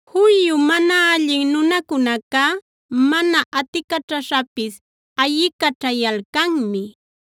Juyu mana allin nunacunacá mana aticaćhaśhapis ayicaćhayalcammi;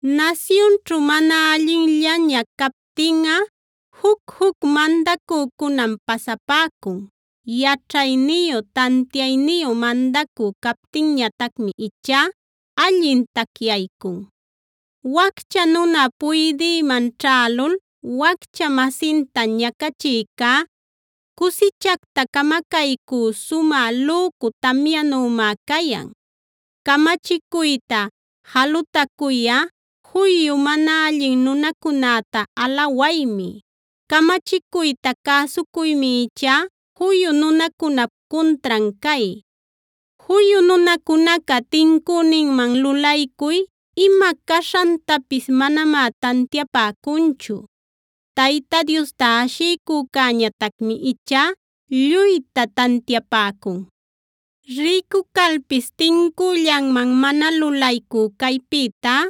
Nasyunćhu mana allinllaña captinꞌa juc-juc mandacücunam pasapäcun. Yaćhayniyu, tantiayniyu mandacü captinñatacmi ichá allin tacyaycun. Waccha nuna puydïmanb ćhälul waccha-masinta ñacachïcá, cusichacta camacaycü sumä lücu tamyanümá cayan. Camachicuyta jalutacuyꞌa juyu mana allin nunacunäta alawaymi. Camachicuyta cäsucuymi ichá juyu nunacunap cuntran cay. Juyu nunacunaca tincüninman lulaycuy ima caśhantapis manamá tantiapäcunchu; Tayta Diosta ashiycücäñatacmi ichá lluyta tantiapäcun. Rïcu calpis tincüllanman mana lulaycü caypïtá,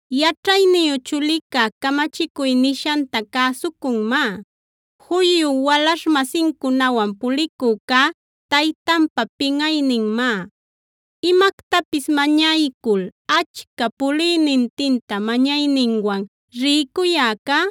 Yaćhayniyu chulicá camachicuy nishanta cäsucunmá; juyu walaśh-masincunawan pulicücá taytanpa pinꞌayninmá. Imactapis mañaycul achca puliynintinta mañayninwan rïcuyäcá,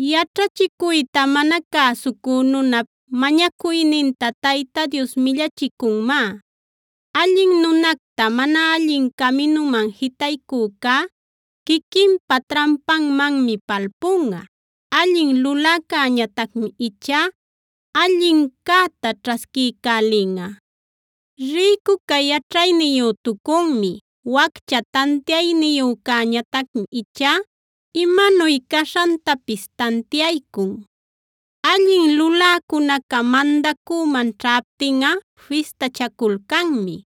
Yaćhachicuyta mana cäsucü nunap, mañacuyninta Tayta Dios millachicunmá. Allin nunacta mana allin caminuman jitaycücá, quiquinpa trampanmanmi palpunꞌa. Allin luläcäñatacmi ichá allincäta ćhasquiycälinꞌa. Rïcuca yaćhayniyütucunmi; waccha tantiayniyücäñatacmi ichá imanuy caśhantapis tantiaycun. Allin luläcunaca mandacüman ćhaptinꞌa fistachaculcanmi;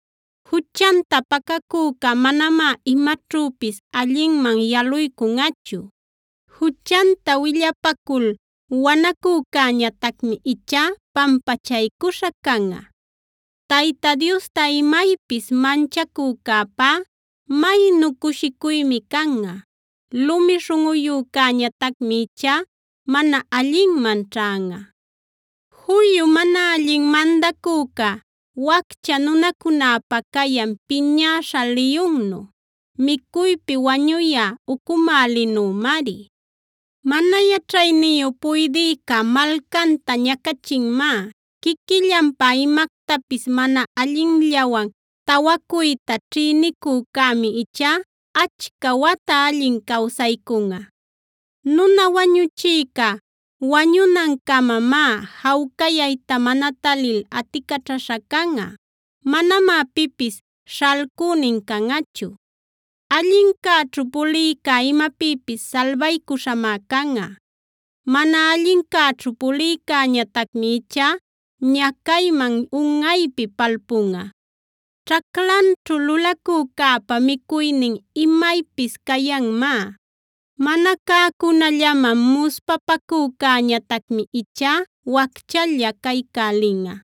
Juchanta pacacüca manamá imaćhüpis allinman yaluycunꞌachu; juchanta willapacul wanacücäñatacmi ichá pampachaycuśha canꞌa. Tayta Diosta imaypis manchacücäpá maynu cushicuymi canꞌa; lumi śhunꞌuyücäñatacmi ichá mana allinman ćhanꞌa. Juyu mana allin mandacüca, waccha nunacunäpä cayan piñäśha liyunnu, micuypi wañuyä ucumälinümari. Mana yaćhayniyu puydïca malcanta ñacachinmá. Quiquillanpä imactapis mana allinllawan tawacuyta ćhïnicücämi ichá achca wata allin cawsaycunꞌa. Nuna wañuchïca wañunancamamá jawcayayta mana talil aticaćhaśha canꞌa; manamá pipis śhalcünin canꞌachu. Allincäćhu pulïca imapïpis salbaycuśhamá canꞌa. Mana allincäćhu pulïcäñatacmi ichá ñacayman unꞌaypi palpunꞌa. Ćhaclanćhu lulacücäpa micuynin imaypis cayanmá. Mana cäcunallaman muspapacücäñatacmi ichá wacchalla caycälinꞌa.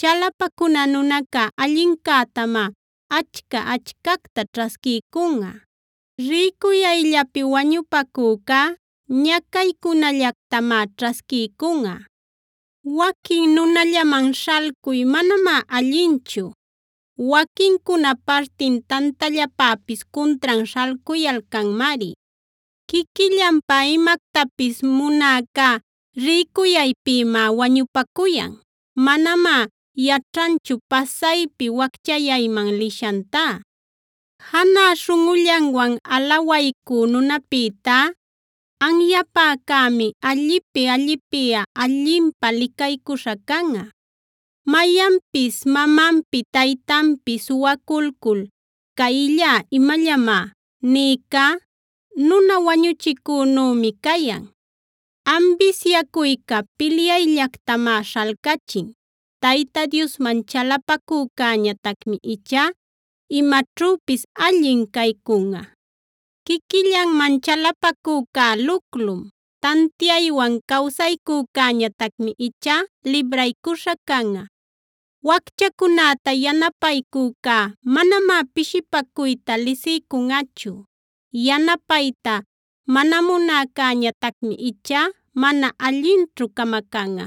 Chalapacuna nunaca allincätamá achca-achcacta ćhasquiycunꞌa; rïcuyayllapi wañupacücá ñacaycunallactamá ćhasquiycunꞌa. Waquin nunallaman śhalcuy manamá allinchu; waquincuna partin tantallapäpis cuntran śhalcuyalcanmari. Quiquillanpä imactapis munäca rïcuyaypïmá wañupacuyan; manamá yaćhanchu pasaypi wacchayayman lishantá. Janä śhunꞌullanwan alawaycü nunapïtá, anyapäcämi allipi-allipiꞌa allinpä licaycuśha canꞌa. Mayanpis mamanpi taytanpi suwaculcul: “Cayllá imallamá” nïcá, nuna wañuchicünümi cayan. Ambisyacuyca pilyayllactamá śhalcachin; Tayta Diosman chalapacücäñatacmi ichá imaćhüpis allin caycunꞌa. Quiquillanman chalapacücá luclum; tantiaywan cawsaycücäñatacmi ichá libraycuśha canꞌa. Wacchacunäta yanapaycücá manamá pishipacuyta lisiycunꞌachu; yanapayta mana munäcäñatacmi ichá mana allinćhu camacanꞌa.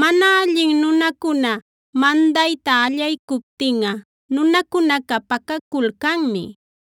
Mana allin nunacuna mandayta allaycuptinꞌa nunacunaca pacaculcanmi;